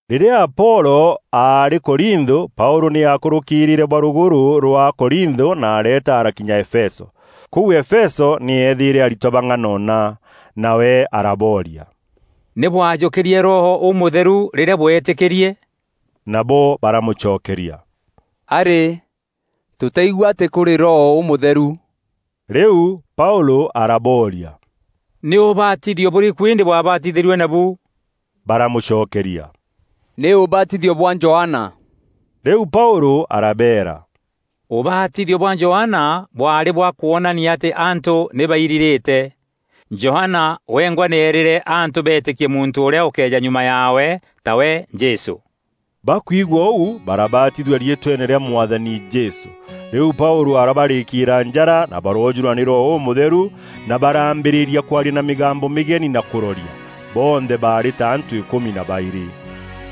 Rîrîa Apolo aarî Korintho, Paûlû nî aakûrûkîrîîre bwa rugûrû rwa Korintho na areeta arakinya Efeso. Kûu Efeso nî eethîîre aritwa bang'anona. Nawe arabooria, “Nî bwajûkîrîe Roho Ûmûtheru rîrîa bwetîkîrie?” Nabo baramûcokeria, “Arî! Tûtaigua atî kûrî Roho Ûmûtheru.” Rîu Paûlû arabooria, “Nî ûbatithio bûrîkû îndî bwabatithîrue nabu?” Baramûcokeria, “Nî ûbatithio bwa Johana.” Rîu Paûlû arabeera, “Ûbatithio bwa Johana bwaarî bwa kwonania atî antû nî bairirîte. Johana wengwa nî eerîre antû beetîkie muntû ûrîa ûkeeja nyuma yaawe, tawe Jesû.” Bakwigua ûu, barabatithua riîtweene rîa Mwathani Jesû. Rîu Paûlû arabarîkîîra njara, na baroojûrwa nî Roho Ûmûtheru na barambîrîria kwaria na mîgambo mîgeni na kûroria. Bonthe baarî ta antû îkûmi na baîrî.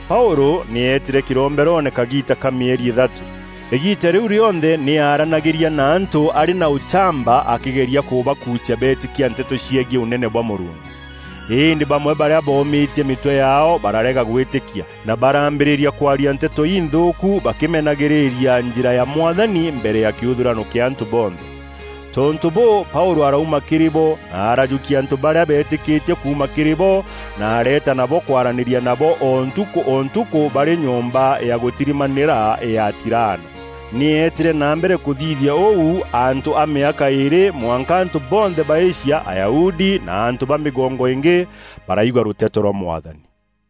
Paûlû nî eetîre kîromberoone kagiita ka mîeri îthatû. Îgiita rîu rîonthe nî aaranagîria na antû arî na ûchamba akîgeragia kûbakuucia beetîkia nteto ciegiî Ûnene bwa Mûrungu. Îndî bamwe barîa boomîtie mîtwe yaao bararega gwîtîkia, na barambîrîria kwaria nteto înthûûku bakîmenagîîria Njîra ya Mwathani, mbere ya kîûthûrano kîa antû bonthe. Tontû bûû, Paûlû arauma kîrî bo na araajûkia antû barîa beetîkîtie kuuma kîrî bo, na areeta nabo kwaranîria nabo o ntukû o ntukû barî nyomba ya gûtirimanîra ya Tirano. Nî eetîre na mbere kûthithia ûu antû a mîaka îîrî mwanka antû bonthe ba Asia, Ayahudi na antû ba mîgongo ingî, baraigua rûteto rwa Mwathani.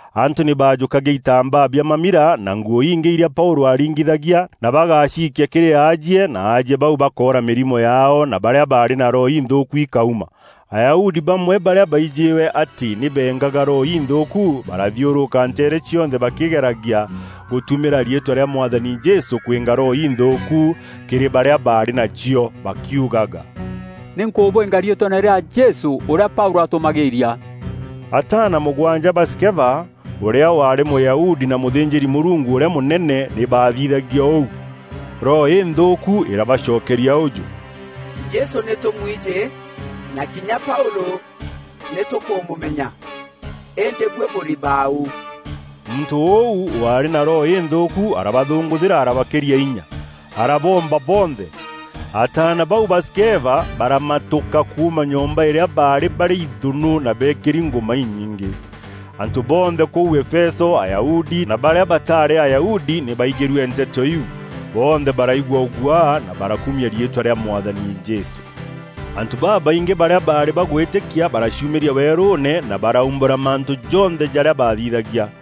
Antû nî baajûkagia itambaa bia mamira na nguû ingî îrîa Paûlû aaringithagia na bagaciikia kîrî aajie na aajie bau bakoora mîrimo yaao, na barîa baarî na roho inthûûku ikauma. Ayahudi bamwe barîa baîjîwe atî nî beengaga roho inthûûku barathiûrûka nteere cionthe bakîgeragia gûtumîra riîtwa rîa Mwathani Jesû kwînga roho inthûûku kîrî barîa baarî nacio, bakiugaga, “Nî nkûbwinga riîtweene rîa Jesû ûrîa Paûlû atûmagîîria.” Ataana mûgwanja ba Skeva, ûrîa waarî Mûyahudi na mûthînjîri-Mûrungu ûrîa mûnene, nî baathithagia ûu. Roho înthûûku irabacokeria ûjû, “Jesû nî tûmuijî, na kinya Paûlû nî tûkûmûmenya, îndî buî bûrî bau?” Muntû ûu waarî na roho înthûûku arabathûngûthîra, arabakîria inya, araboomba bonthe. Ataana bau ba Skeva baramatûka kuuma nyomba îrîa baarî barî ithûnû na beekîri ngûma inyingî. Antû bonthe kûu Efeso, Ayahudi na barîa bataarî Ayahudi nî baaigîrue nteto iu. Bonthe baraigua ûguaa na barakumia riîtwa rîa Mwathani Jesû. Antû babaingî barîa baarî bagwîtîkia baraciumîria weerûûne na baraumbûra mantû jonthe jarîa baathithagia.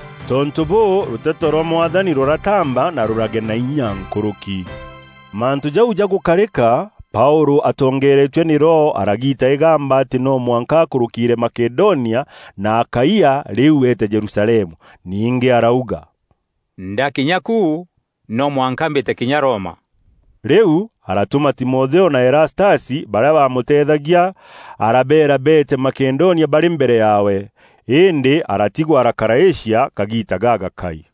Tontû bûû, rûteto rwa Mwathani rûrataamba na rûragea na inya nkûrûki. Mantû jau jagûkarîka, Paûlû atongeeretue nî Roho, aragiita îgamba atî no mwanka akûrûkîîre Makedonia na Akaia rîu eete Jerusalemu. Ningî arauga, “Ndakinya ku, no mwanka mbîte kinya Roma.” Rîu aratûma Timotheo na Erastasi, barîa baamûteethagia, arabeera beete Makedonia barî mbere yaawe. Îndî aratigwa arakara Asia kagiita gagakai.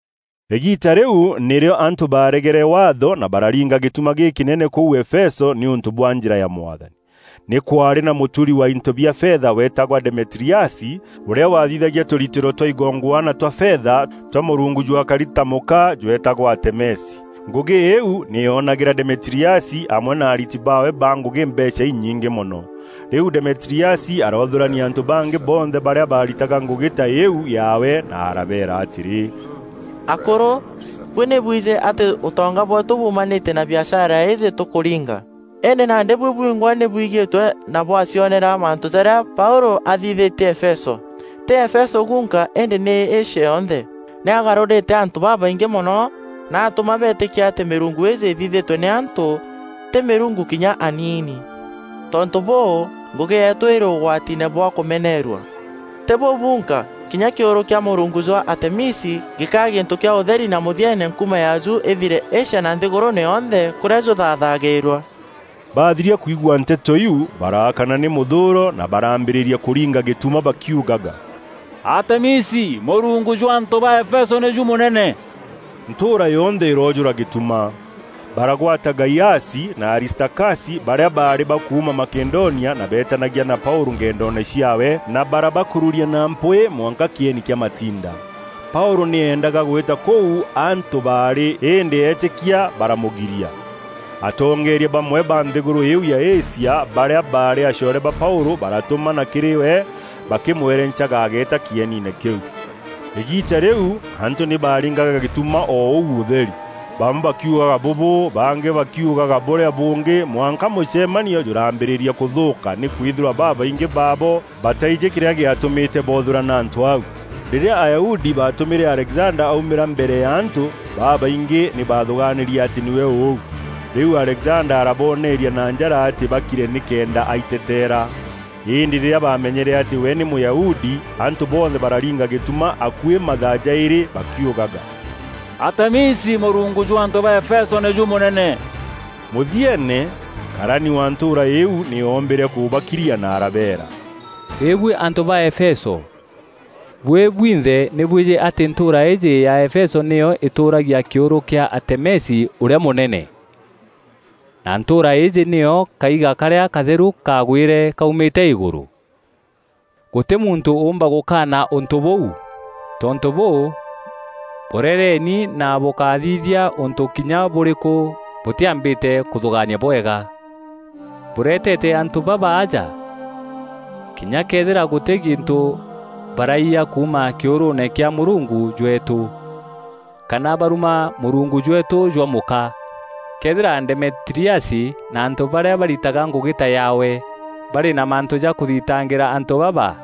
Îgiita rîu nîrîo antû baaregere waatho na bararinga gîtuma gîkînene kûu Efeso nîûntû bwa Njîra ya Mwathani. Nî kwaarî na mûturi wa into bia fetha weetagwa Demetiriasi, ûrîa wathithagia tûritîro twa igongwana twa fetha, twa mûrungu jwakari ta mûka jweetagwa Atemisi. Ngûgî îîu nî yoonagîra Demetiriasi amwe na ariti baawe ba ngûgî mbeecha inyingî mono. Rîu Demetiriasi aroothûrania antû bangî bonthe barîa baaritaga ngûgî ta îîu yaawe na arabeera atîrî, “Akûrû, buî nî bwijî atî ûtonga bweetû buumanîtie na biashara îîjî tûkûringa. Îndî nandî buî bwingwa nî bwigîîtue na bwacionera mantû jarîa Paûlû athithîtie Efeso; tî Efeso gunka îndî nî Asia yonthe. Nî agarûrîte antû babaingî mono na atûma beetîkia atî mîrungu îîjî îthithîtue nî antû, tî mîrungu kinya aniini. Tontû bûû, ngûgî yeetû îrî ûgwatiine bwa kûmeneerua. Tî bûu bunka, kinya kîûrû kîa mûrungu jwa Atemisi gîkaa gîntû kîa ûtheri na mûthieene nkuma yaaju îthire Asia na nthîgûrûûne yonthe, kûrîa jûthaathagîrua.” Baathiria kwigua nteto iu, baraakana nî mûthûûro na barambîrîria kûringa gîtuma bakiugaga, “Atemisi, mûrungu jwa antû ba Efeso nîjû mûnene!” Ntûûra yonthe îroojûra gîtuma. Baragwata Gaiasi na Aristakasi barîa baarî ba kuuma Makedonia na beetanagia na Paûlû ngendoone ciaawe, na barabakururia na mpwîî mwanka kîeni kîa matinda. Paûlû nî eendaga gwîta kûu antû baarî, îndî eetîkia baramûgiria. Atongeeria bamwe ba nthîgûrû îîu ya Asia, barîa baarî acoore ba Paûlû baratûmana kîrî we bakîmwerencaga ageeta kîeniine kîu. Îgiita rîu antû nî baaringaga gîtuma o ûu ûtheri; bamwe bakiugaga bûbû, bangî bakiugaga bûrîa bûngî mwanka mûcemanio jûrambîrîria kûthûûka nîkwîthîrwa babaingî baabo bataijî kîrîa gîatûmîte boothûrana antû au. Rîrîa Ayahudi baatûmîre Alexanda aumîra mbere ya antû, babaingî nî baathûgaanîrie atî nîwe ûu. Rîu Alexanda araboneeria na njara atî bakire nîkenda aiteteera. Îndî rîrîa baamenyere atî we nî Mûyahudi, antû bonthe bararinga gîtuma akuî mathaa jaîrî bakiugaga, “Atemisi, mûrungu jwa antû ba Efeso nîjû mûnene!” Mûthieene, karani wa ntûûra îîu nî oombîre kûbakiria na arabeera, “Îbuî antû ba Efeso, buî bwinthe nî bwijî atî ntûûra îîjî ya Efeso nîyo îtûûragia kîûrû kîa Atemisi ûrîa mûnene, na ntûûra îîjî nîyo kaiga karîa katheru kaagwîre kaumîte îgûrû. Gûtî muntû ûûmba gûkaana ûntû bûu. Tontû bûû, borereeni na bûkáthithia ûntû kinya bûrîkû bûtîambîte kûthûgaania bwega. Bûretete antû baba aja, kinya këethîra gûtî gîntû baraiya kuuma kîûrûûne kîa mûrungu jweetû, kana baruma mûrungu jweetû jwa mûka. Këethîra Demetiriasi na antû barîa baritaga ngûgî ta yaawe, barî na mantû ja kûthitangîra antû baba,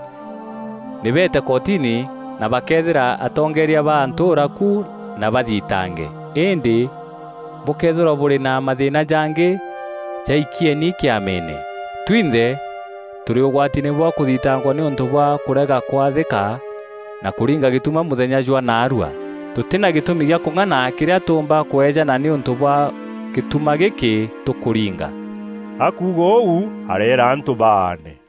nî beete kotini na bakeethîra atongeeria ba ntûûra ku na bathitange. Îndî bûkëethîrwa bûrî na mathîîna jangî, jaikieni Kîameene. Twinthe tûrî ûgwatiine bwa kûthitangwa nîûntû bwa kûrega kwathîka na kûringa gîtuma mûthenya jwa naarua. Tûtî na gîtûmi gîa kûng'ana kîrîa tûûmba kweejana nîûntû bwa gîtuma gîkî tûkûringa.” Akuuga ûu, areera antû baane.